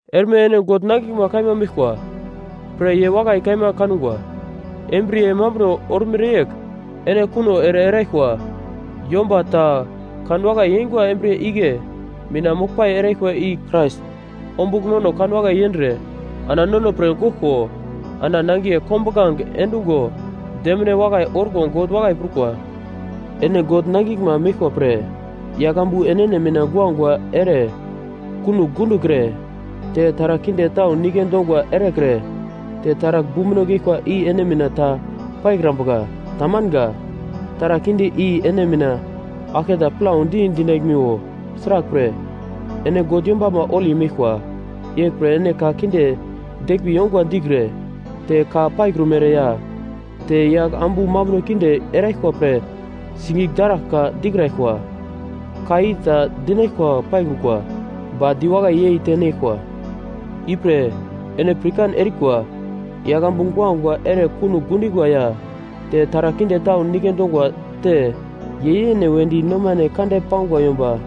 Erme ene God nangiglma kaima meglkwa pre ye wakai kaima kangwa, embriye mambuno ormere yegl ene kuno ere eraglkwa. Yomba ta kanwakai yeingwa embriye igle mina moglpai eraglkwa i Krais ombugl nono kanwakai yendre ana nono pre goglko ana nangiye kombuglange endungo demine wakai orko God wakai prukwa. Ene God nangiglma meglkwa pre, yagl ambu enene mina guagua ere kunogl gundokre, te taragl kinde tau nike dongwa erekre te taragl bumbuno geglkwa i ene mina ta paikrambuka. Tamanga. Taragl kinde i ene mina aglke ta plaudi dinaglmiwo, sraglpre, ene God yombama holi meglkwa. Yeglpre ene ka kinde deglmbi yongwa dikre, te ka paikrumere ya te yagl ambu mambuno kinde eraglkwa pre sigigl daraglka dikraglkwa. Ka i ta dinaglkwa paikrukwa, ba di wakai yei tenaglkwa. Ipre, ene pirkan erikwa. Yagl ambu guagua ere kunogl gundingwa ya te taragl kinde tau nike dongwa te ye yene wedi nomane kande pangwa yomba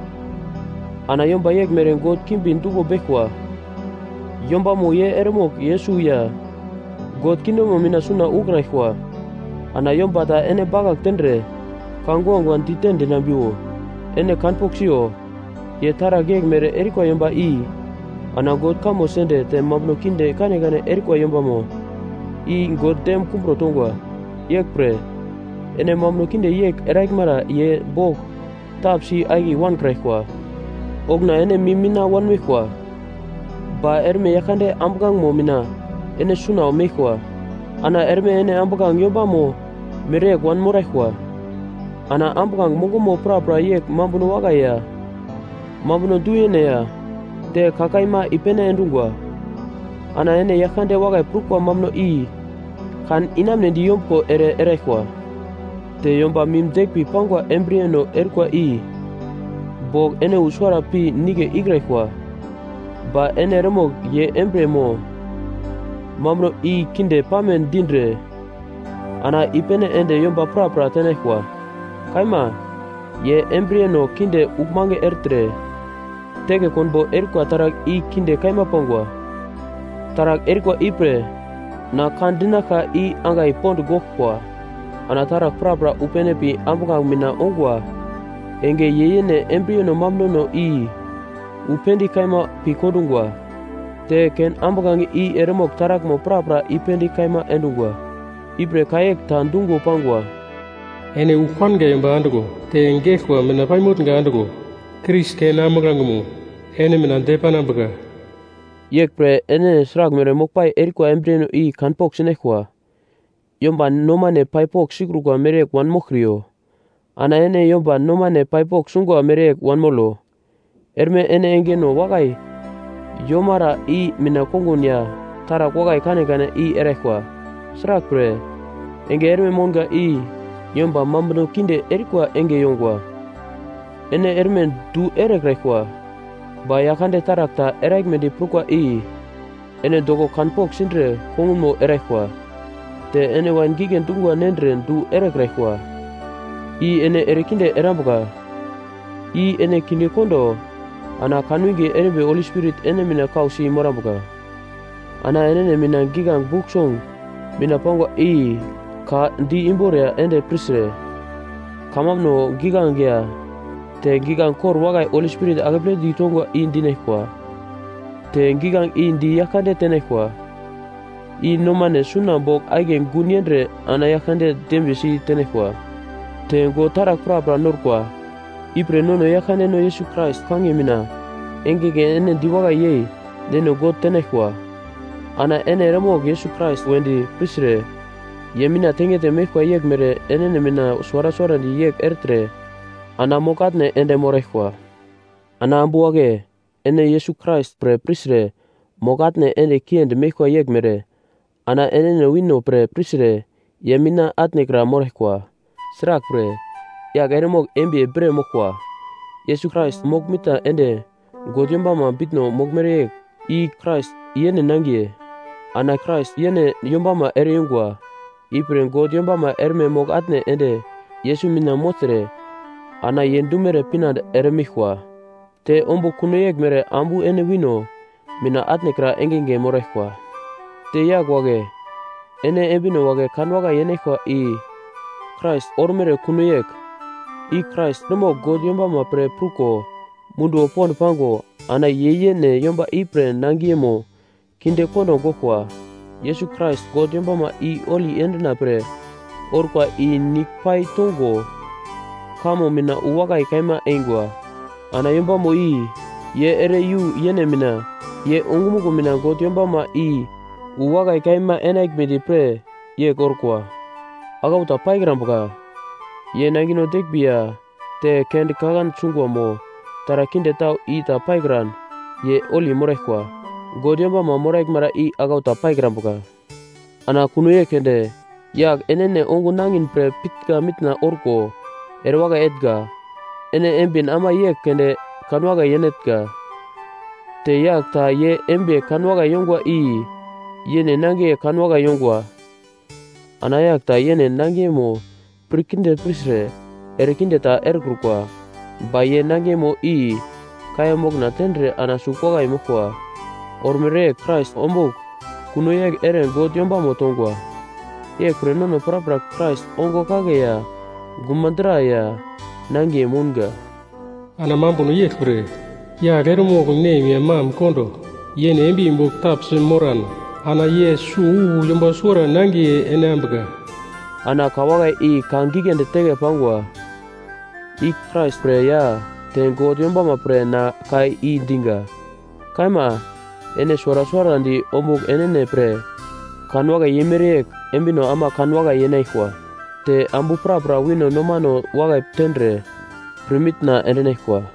ana yomba yeglmere god kimbi duglo beglkwa, yombamo ye eremogl Yesus ya God kingdomno mina suna ukraglkwa. Ana yomba ta ene bakagl tendre, ka guagua dite dinambiwo, ene kanpogl siyo, ye taragl yeglmere erikwa yomba i ana God kamo sende te mambuno kinde kanekane erikwa yombamo i God dem kumbro tongwa. Yeglpre, ene mambuno kinde yegl eraglmara ye bogl tapsi akiye wankraglkwa. Okuna ene mim mina wanmeglkwa, ba erme Yaglkande ambuglangemo mina ene suna meglkwa. Ana erme ene ambuglange yombama mereyegl wanmoraglkwa. Ana ambuglange mongomo prapra yegl mambuno wakai ya, mambuno du-yene ya, te ka kaima i-pene endungwa. Ana ene Yaglkande wakai prukwa mambuno i kan inamunedi yombuglo ere eraglkwa. Te yomba mim deglmbi pangwa embriyeno erikwa i bogl ene wu suwara pi nigle ikraglkwa. Ba ene eremogl ye embriye mo mambuno i kinde pame dindre ana i-pene ende yomba prapra tenaglkwa. Kaima, ye embriyeno kinde uglmange ertre teke konbo erikwa taragl i kinde kaima pangwa. Taragl erikwa ipre na ka dinaglka i angai pond goglkwa. Ana taragl prapra wu pene pi ambuglange mina ongwa enge ye yene embriyeno mambunono i wu pendigl kaima pi kondungwa, te ken ambuglange i eremogl taraglmo prapra i-pendigl kaima endungwa. Ipre ka yegl ta dungo pangwa: “Ene ugl panga yomba andiglo, te geglkwa mina pai motnga andiglo, Krais ken ambuglangemo ene mina depanambuka.” Yeglpre, ene sraglmere moglpai erikwa embriyeno i kan pogl sinaglkwa. Yomba nomane pai pogl sikrukwa mereyegl wanmoglkriyo, ana ene yomba nomane pai pogl sungwa mereyegl wanmolo. Erme ene engeno wakai yomara i mina kongun ya taragl wakai kanekane i eraglkwa, sraglpre, enge erme mounga i yomba mambuno kinde erikwa enge yongwa. Ene erme du erekraglkwa, ba Yaglkande taragl ta eraglmedi prukwa i ene doko kanpogl sindre kongunmo eraglkwa. Te ene wain gigle dungwa nendre du erekraglkwa, i ene erekinde erambuka, i ene kinde kondo, ana kanwinge erimbi Holi Spirit ene mina kausi morambuka. Ana enene mina giglange Buk Song mina pangwa i ka di imbor ya ende pirtre, kamambuno giglange ya te giglange kor wakai Holi Spirit akepledi tongwa i dinaglkwa, te giglange i di Yaglkande tenaglkwa, i nomane suna bogl akiye gun yendre ana Yaglkande dembiye sitenaglkwa. Te God taragl prapra norkwa, ipre nono Yaglkandeno Yesus Krais kangiye mina engenge ene diwakai yei Neno God tenaglkwa. Ana ene eremogl Yesus Krais wedi pirtre ye mina tengete meglkwa yeglmere enene mina suwara suwarandi yegl ertre ana mogl-atne ende moraglkwa. Ana ambu wagle ene Yesus Krais pre pirtre mogl-atne ende kiendi meglkwa yeglmere ana enene wino pre pirtre ye mina atne kra moraglkwa. Sraglpre, yagl eremogl embiye bre moglkwa, Yesus Krais mogl-mitna ende God yombama bitno moglmere yegl, i Krais yene nangiye. Ana Krais yene yombamo ere-yungwa. Ipre God yombama erme mogl-atne ende Yesus mina mogltre ana ye dumere pinande eremeglkwa, te ombugl kuno yeglmere ambu ene wino mina atnekra engenge moraglkwa. Te yagl wagle ene embino wagle kanwakai yenaglkwa i Krais ormere kuno yegl, i Krais eremogl God yombama pre pruko munduwo pond pango ana ye yene yomba ipre nangiyemo kinde kondo goglkwa. Yesus Krais, God yombama i holi endina pre orkwa i nigl pai tongo kamo mina wu wakai kaima eingwa. Ana yombama i, ye ere i-yu yene mina ye ongumuglo mina God yombama i wu wakai kaima enaglmedi pre yegl orkwa, aglau ta paikrambuka. Ye nangino deglmbi ya te kende kaglande sungwa mo taragl kinde tau i ta paikran ye holi moraglkwa. God yombama moraglmara i aglau ta paikrambuka. Ana kuno yegl keunde yagl enene ongun nangin pre pitnga mitna orko erewakai etnga; ene embin ama yegl keunde kanwakai yeinatnga. Te yagl ta ye embiye kanwakai yongwa i yene nangiye kanwakai yongwa. Ana yagl ta yene nangiyemo pir kinde pirtre erekinde ta erekrukwa, ba ye nangiyemo i kaiya mokna tendre ana sugl wakai moglkwa, ormere yegl Krais ombugl kuno yegl ere God yombamo tongwa. Yeglpre nono prapra Krais ongo kagle ya guma dra ya nangiye mounga. “Ana mambuno yeglpre, yagl eremogl nem ya mam kondo yene embiye bogl tapsi moran, ana ye suwo wu yomba suwara nangiye enambuka.” Ana ka wakai i ka giglendi teke pangwa, i Krais pre ya te God yombama pre na ka i diga. Kaima, ene suwara suwarandi ombugl enene pre kanwakai yeimere yegl embino ama kanwakai yenaglkwa, te ambu prapra wino nomano wakai tendre pirmitna endinaglkwa.